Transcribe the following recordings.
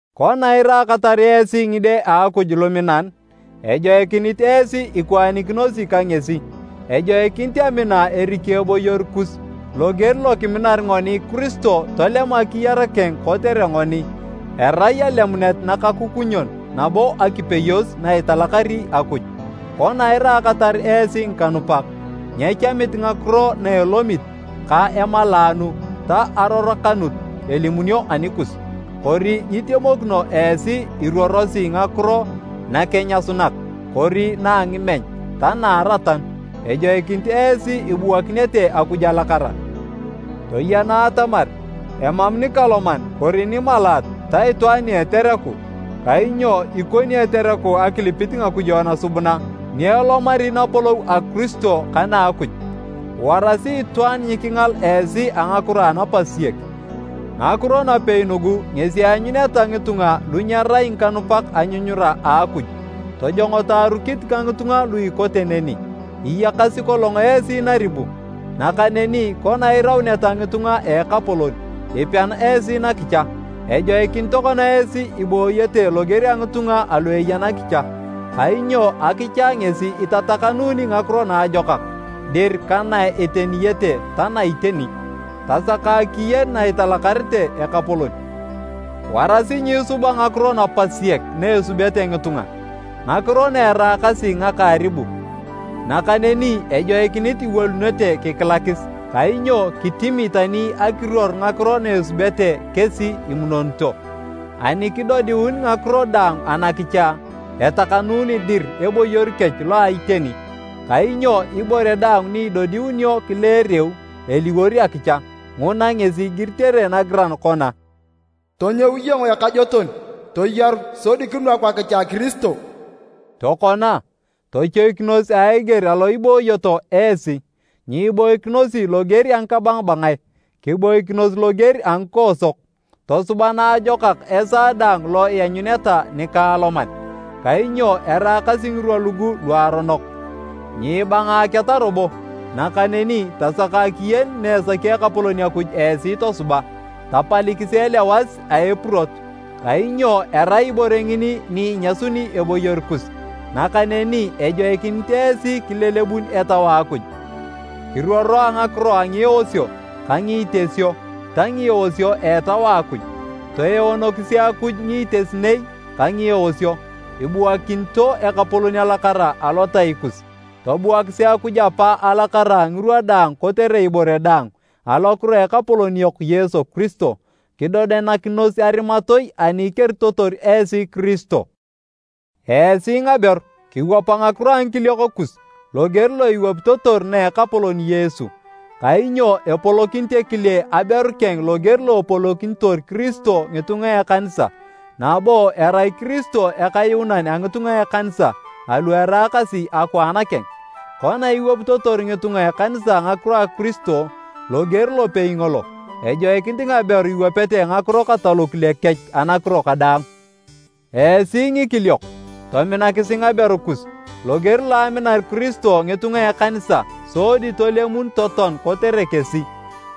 Kona iraakatar esi ngide a Akuj luminan, ejoikinit esi ikwaanikinosi ka ngesi. Ejoikinit amina eriki eboyor kus, loger lokiminar ngoni Kiristo tolem akiyar keng kotere ngoni, erai alemunet nakakukunyon nabo akipeyos na italakari Akuj. Kona iraakatar esi ngikanupak, nyechamit ngakiro na elomit, ka emalaanu ta arorokanut elimunio anikus. Kori nyitemokino esi iruorosi ngakiro nakenyasunak kori na a ngimeny ta na a aratanu. Ejoikinit esi ibuakinete Akuj alakara. Toyena atamar emam nikaloman kori nimalaat ta itwaan ni etereku (kainyo ikoni etereku akilipit ngakujo nasubuna) ni elomari napolou a Kiristo ka na a Akuj. Warasi itwaan nyikingal esi a ngakiro anapasiyek, ngakiro napei nugu ngesi eanyuneta ngitunga lu nyerai ngikanupak anyunyura a Akuj. Tojongoto arukit ka ngitunga lu ikote neni. Iyakasi kolong esi naribu, nakaneni kona irauneta ngitunga a Ekapolon, ipean esi nakicha. Ejoikinit tokona esi ibooyete loger a ngitunga alu eya nakicha. Kainyo akicha ngesi itatakanuuni ngakiro naajokak dir ka na eteniyete ta na iteni. Tasaka akiyen na italakarete Ekapolon. Warasi nyiisuba ngakiro napasiyek na esubete ngitunga, ngakiro na eraakasi ngaka aribu. Nakaneni ejoikinit iwolunete kikilakis. ( Kainyo kitimi tani akiruor ngakiro na esubete kesi imunonito.) Ani kidodiun ngakiro daang anakicha, etakanuni dir eboyor kech lo a iteni, kainyo ibore daang ni idodiunio kileereu, eliwor akicha. Nguna ngesi igiritere nagiran kona, “Tonyou iyong ekajoton, toyaru, sodi kinwaku akicha a Kiristo.” Tokona, tochoikinos a eger alo ibooyoto esi. Nyiboikinosi loger a ngikabangabangae, kiboikinos loger a ngikoosok. Tosuba naajokak esaa daang lo ianyuneta nikaaloman, kainyo eraakasi ngirwa lugu luaronok. Nyiibangaketa robo, nakaneni tasaka akiyen na esaki Ekapolon Akuj esi tosuba. Tapalikisi elewas a epurot, kainyo erai ibore ngini ni inyasuni eboyor kus, nakaneni ejoikinit esi kilelebun Etau a Akuj. Kiruoro a ngakiro a ngieosio ka ngiitesio ta ngieosio a Etau a Akuj, toeonokisi Akuj ngiitesinei ka ngieosio, ibuakinito Ekapolon alakara alotai kus. Tobuakisi Akuj Apa alakara ngirwa daang kotere ibore daang, alokiro a Ekapolon yok Yesu Kiristo. Kidodenakinos arimatoi ani ikeritotor esi Kiristo. Esi ngaberu, kiwapa ngakiro a ngikiliok kus loger lo iwapitotor na a Ekapolon Yesu. Kainyo epolokinit ekile aberu keng loger lo epolokinitor Kiristo ngitunga a ekanisa, nabo erai Kiristo Ekayuunan a ngitunga a ekanisa alu eraakasi akwaan keng. Kona iwapitotor ngitunga a ekanisa ngakiro a Kiristo, loger lopei ngolo, ejoikinit ngaberu iwapete ngakiro kata lokile kech anakiro kadaang. Esi ngikiliok, tominakisi ngaberu kus loger lo aminar Kiristo ngitunga a ekanisa sodi tolemun totoan kotere kesi.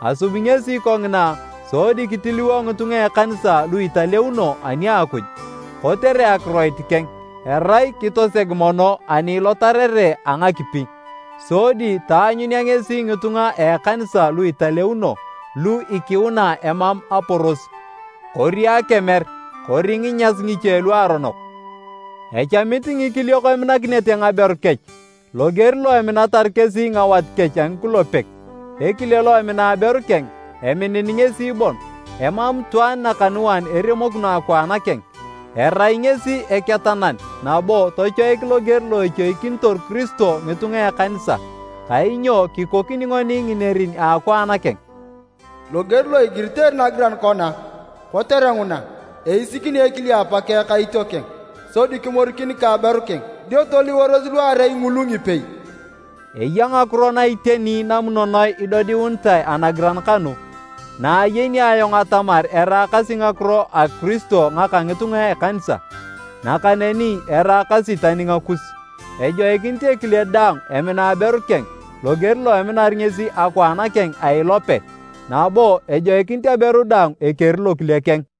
Asubi ngesi kongina sodi kitiliwo ngitunga a ekanisa lu italeuno ani a Akuj, kotere akiroit keng, erai kitoseg mono ani ilotarere a ngakipi. Sodi taanyunea ngesi ngitunga a ekanisa lu italeuno, lu ikiuna emam aporos, kori akemer kori nginyas ngiche luaronok. Echamit ngikiliok eminakinete ngaberu kech loger lo eminatar kesi ngawat kech a ngikulepek. Ekile lo emina aberu keng, eminin ngesi bon. ( Emam itwaan nakanuan eremokino akwaan keng, erai ngesi eketanan nabo tochoik loger lo echoikinitor Kiristo ngitunga a ekanisa: kainyo kikoni ngoni nginerin a akwaan keng.) Loger lo igiritere nagiran kona, “kotere nguna, eisikini ekile apakeng ka itiokeng, sodi kimorikin ka aberu keng, dio toliworos luarei ngulu ngipei.” Eya ngakiro na iteni namunonoe idodiunitae anagiran kanu, na ayeni ayong atamar eraakasi ngakiro a Kiristo ka ngitunga a ekanisa. Nakaneni eraakasi tani ngakus, ejoikinit ekile daang emina aberu keng loger lo eminar ngesi akwaan keng a ilope, nabo ejoikinit aberu daang ekeri lokile keng.